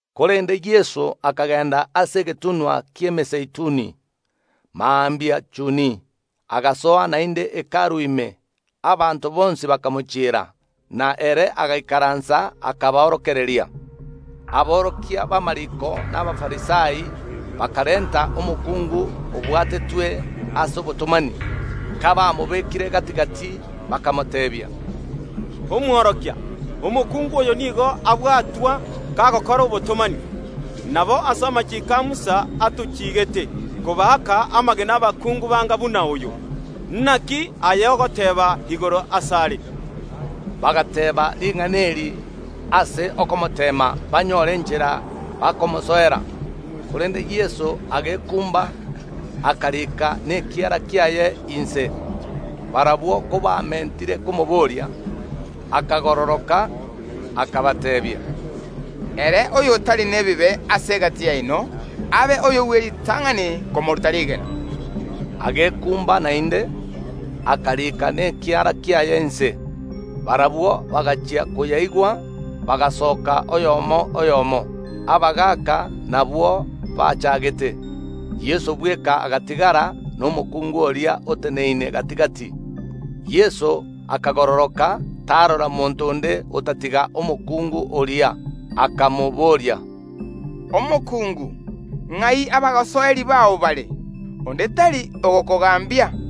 Korende Yeso akagenda ase egetunwa ki’Emezeituni. Mambia chuni agasoa naende Hekalu ime. Abanto bonsi bakamochiera, na ere agaikaransa, akaborokereria. Aborokia b’amariiko na Abafarisai bakarenta omokungu obwatetwe ase obotomani. Kabamobekire gati‐gati, bakamoteebia, “Omworokia, omokungu oyo nigo abwatwa kagokora obotomani. Nabo ase amachiiko Musa atochigeete kobaaka amagena abakungu banga buna oyo, naki aye ogoteeba igoro asare?” Bagateeba ring’ana eri ase okomoteema, banyore enchera bakomosoera. Korende Yeso agekumba, akarika nekiara kiaye inse. Barabwo kobamentire komoboria, akagororoka, akabateebia, “Ere oyotari nebibe ase egati yaino abe oyo bw’eritang’ani komoruta rigena.” Agekumba naende, akarika nekiara kiaye inse. Barabwo bagachia koyaigwa, bagasoka oyomo ase oyomo, abagaaka nabwo bachaagete. Yeso bweka agatigara, na omokungu oria oteneine gati‐gati. Yeso akagororoka tarora monto onde otatiga omokungu oria, akamobooria, “Omokungu, ng’ai abasoeri bao bare? Onde tari ogokogambia?”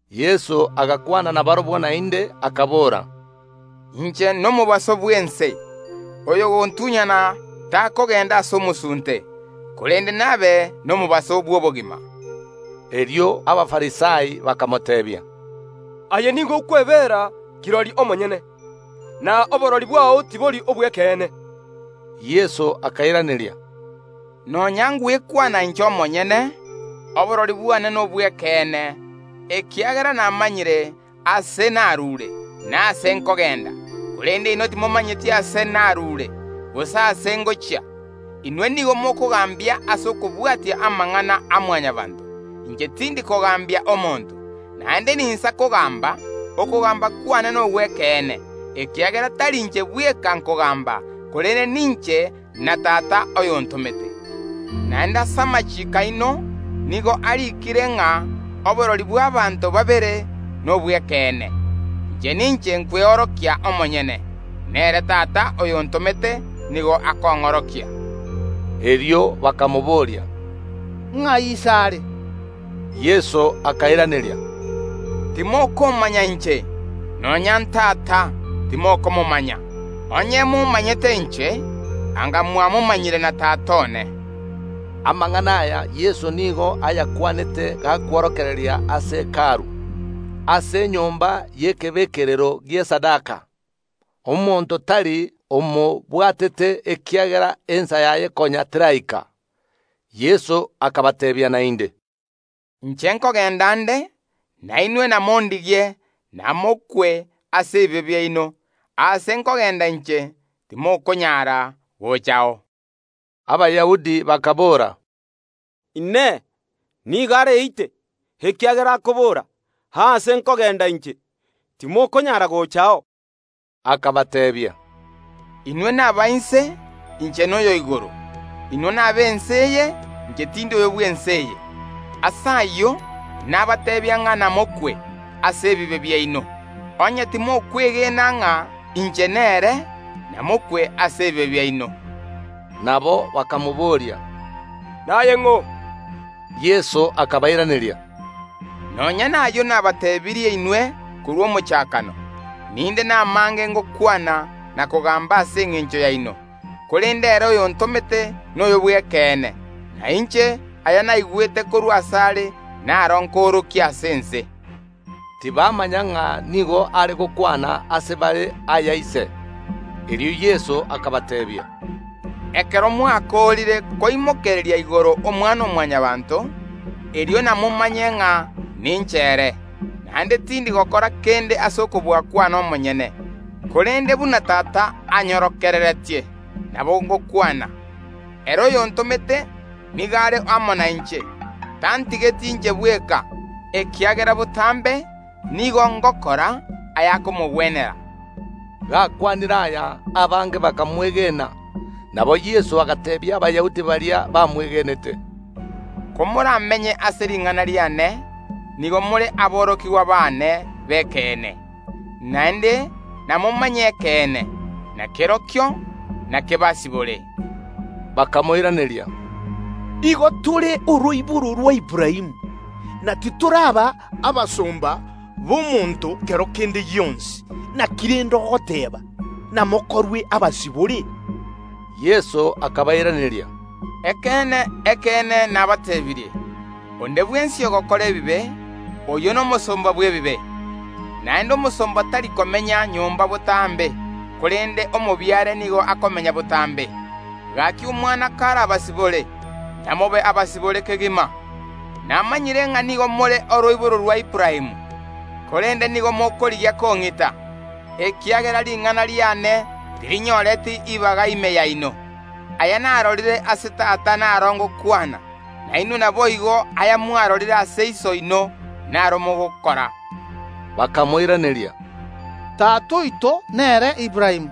Yeso agakwana nabarabwo naende, akabora, “Inche nomobaso bw’ense; oyogontunyana takogenda ase omosunte, korende nabe nomobaso bw’obogima.” Erio Abafarisai bakamoteebia, “Aye nigo okwebera kirori omonyene, na oborori bwao tibori obw’ekeene.” Yeso akairaneria, “Nonya ngwekwana inche omonyene, oborori bwane nobw’ekeene, ekiagera namanyire aase narure, na aase nkogenda; korende inwe timomanyeti aase narure, gose aase ngochia. Inwe nigo mokogambia ase okobwatia amang’ana a Mwanyabaanto; inche tindi kogambia omonto. Naende ninsa kogamba, okogamba kwane nogw’ekeene, ekiagera tari inche bweka nkogamba, korende ninche na Tata oyontomete. Naende ase amachiiko aino nigo ariikire ng’a oborori bw’abaanto babere nobw’ekeene, Inche ninche nkweorokia omonyene, nere Tata oyontomete nigo akong’orokia.” Erio bakamobooria, “Ng’ai Iso are?” Yeso akairaneria, “Timokomanya inche, nonya n’Tata timokomomanya, onye momanyete inche, anga mwamomanyire na Tata one.” Amang’ana aya Yeso nigo ayakwanete, gakworokereria ase Hekalu, ase enyomba y’ekebekerero gi’esadaka; omonto tari omobwatete, ekiagera ensa yaye konya teraika. Yeso akabateebia naende, “Inche nkogenda nde, na inwe namondigie, namokwe ase ebibe biaino; aase nkogenda inche, timokonyara gochao.” Abayahudi bakaboora, “Inee! Nigo areite, ekiagera akobora: Aase nkogenda inche, timokonyara gochao?” Akabateebia, “Inwe naba inse; inche noyo o igoro; inwe nab’ense eye; inche tindi oyo bw’ense eye. Ase ayio nabateebia ng’a namokwe ase ebibe biaino. Onye timokwegena ng’a inche nere, namokwe ase ebibe biaino.” Nabo bakamobooria, “Naye ng’o?” Yeso akabairaneria, “Nonya nayio nabateebirie inwe korwa omochakano. Ninde namange ngokwana na kogamba ase engencho yaino, korende ere oyontomete noyo bw’ekeene; na inche aya naigwete korwa asare, naro nkoorokia ase ense.” Tibamanya ng’a nigo are gokwana ase bare aya Ise. Erio Yeso akabateebia, “Ekero mwakoorire koimokereria igoro Omwana‐o‐mwanya banto, erio namomanye ng’a ninche ere, naende tindi gokora kende ase okobua kwane omonyene, korende buna Tata anyorokereretie, nabo ngokwana. Ere oyontomete nigo are amo nainche, tantigeti inche bweka, ekiagera botambe nigo ngokora ayakomogwenera.” Gakwanire aya, abange bakamwegena. Nabo Yeso agateebia Abayahudi baria bamwegenete, “Komoramenye ase ring’ana riane, nigo more aborokigwa baane b’ekeene, naende namomanye ekeene, na kerokio nakebasibore.” Bakamoiraneria, “Igo tore oroiboro rwa Aburaamu, na titoraba abasomba b’omonto kero kende gionsi, inaki rende ogoteeba: Namokorwe abasibore?” Yeso akabairaneria, “Ekeene, ekeene, nabateebirie: Onde bwensi ogokora ebibe, oyio nomosomba bw’ebibe, naende omosomba tari komenya nyomba botambe, korende omobiare nigo akomenya botambe. Gaki Omwana karabasibore, namobe abasibore kegima. Namanyire ng’a nigo more oroiboro rwa Aburaamu; korende nigo mokorigia kong’ita, ekiagera ring’ana riane tirinyoreti ibaga ime yaino. Aya narorire ase Tata naro ngokwana; nainwe naboigo ayamwarorire ase iso oino, naro mogokora.” Bakamoiraneria, “Tata oito nere Aburaamu.”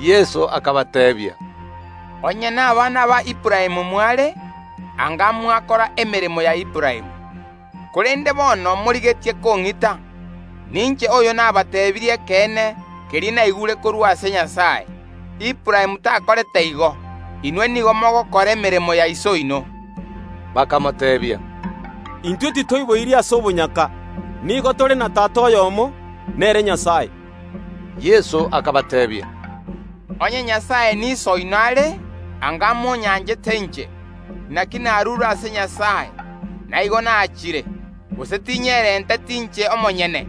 Yeso akabateebia, “Onye nabana ba Aburaamu mware, anga mwakora emeremo ya Aburaamu. Korende bono morigetie kong’ita, ninche oyo nabateebirie ekeene keria naigure korwa ase Nyasae. Aburaamu takorete igo. Inwe nigo mogokora emeremo ya iso oino.” Bakamoteebia, “Intwe titoiboiri ase obonyaka; nigo tore na Tata oyomo, nere Nyasae.” Yeso akabateebia, “Onye Nyasae n’Iso oino are, anga imonyanchete inche; naki narure ase Nyasae, na igo nachire; gose tinyerenteti inche omonyene,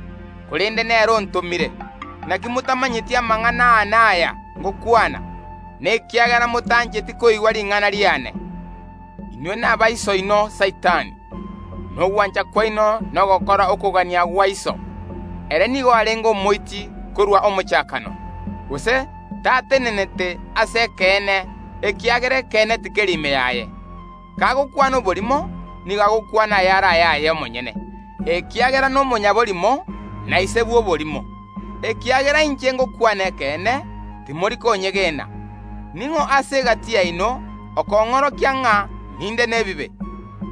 korende nere ontomire. Naki motamanyeti amang’ana aane aya ngokwana? Nekiagera motancheti koigwa ring’ana riane. Inwe n’aba iso oino Saitani, na ogwancha kwaino nogokora okogania gwa iso. Ere nigo arenge omoiti korwa omochakano, gose tatenenete ase ekeene, ekiagera ekeene tikeri ime yaye. Kagokwana oborimo, nigo agokwana ayare ayaye omonyene, ekiagera nomonyaborimo, na ise bw’oborimo. Ekiagera inche ngokwana ekeene, timori konyegena. Ning’o ase egati yaino okong’orokia ng’a ninde nebibe?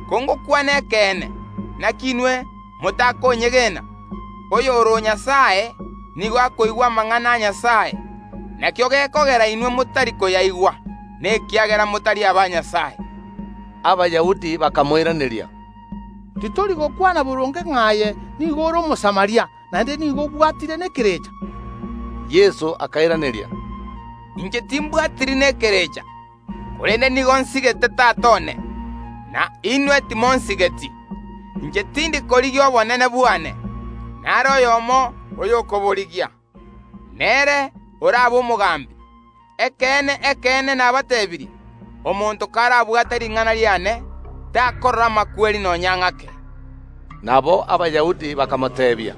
Kongokwana ekeene, naki inwe motakonyegena? Oyore o Nyasae nigo akoigwa amang’ana a Nyasae; nakio gekogera inwe motari koyaigwa: nekiagera motari aba Nyasae.” Abayahudi bakamoiraneria, “Titori gokwana boronge ng’a aye nigo ore Omosamaria, naende nigo obwatire nekerecha?” Yeso akairaneria, “Inche timbwatiri nekerecha, korende nigo nsigete Tata one, na inwe timonsigeti. Inche tindi korigia obonene bwane; nare oyomo oyokoborigia, nere orabe omogambi. Ekeene, ekeene, nabateebirie: Omonto karabwate ring’ana riane, takorora amakweri nonya ng’ake.” Nabo Abayahudi bakamoteebia,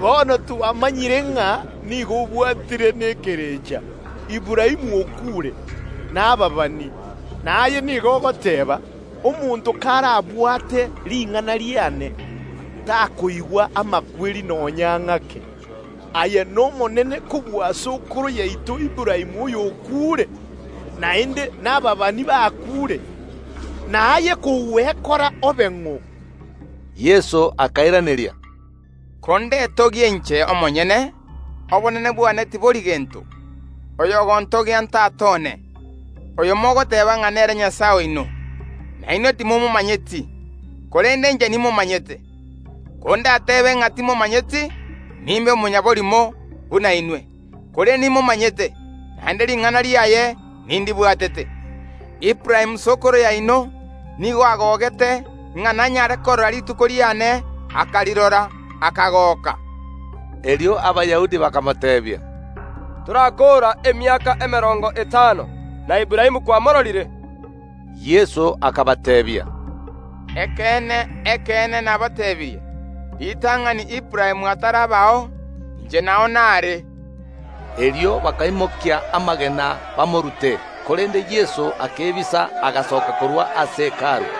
“Bono twamanyire ng’a nigo obwatire nekerecha, Aburaamu okuure, na ababani, na aye nigo ogoteeba: Omonto karabwate ring’ana riane, takoigwa amakweri nonya ng’ake. Aye nomonene kobua sokoro yaito Aburaamu, oyo okuure? Naende nababani bakuure. Naye kogwekora obe ng’o?” Yeso akairaneria, “Kondetogie inche omonyene, obonene bwane tibori gento; oyogontogia n’Tata one, oyo mogoteeba ng’a nere Nyasae oino. Na inwe timomanyeti, korende inche nimomanyete. Kondatebe ng’a timomanyeti nimbe omonyaborimo buna inwe, korende nimomanyete, naende ring’ana riaye nindibwatete. Aburaamu sokoro yaino nigo agogete ng’a nanyare korora rituko riane; akarirora, akagoka.” Erio Abayahudi bakamoteebia, “Torakoora emiaka emerongo etano, na Aburaamu kwamororire?” Yeso akabateebia, “Ekeene, ekeene, nabateebirie: Ritang’ani Aburaamu atarabao, inche nao naare.” Erio bakaimokia amagena bamorute, korende Yeso akebisa, agasoka korwa ase Hekalu.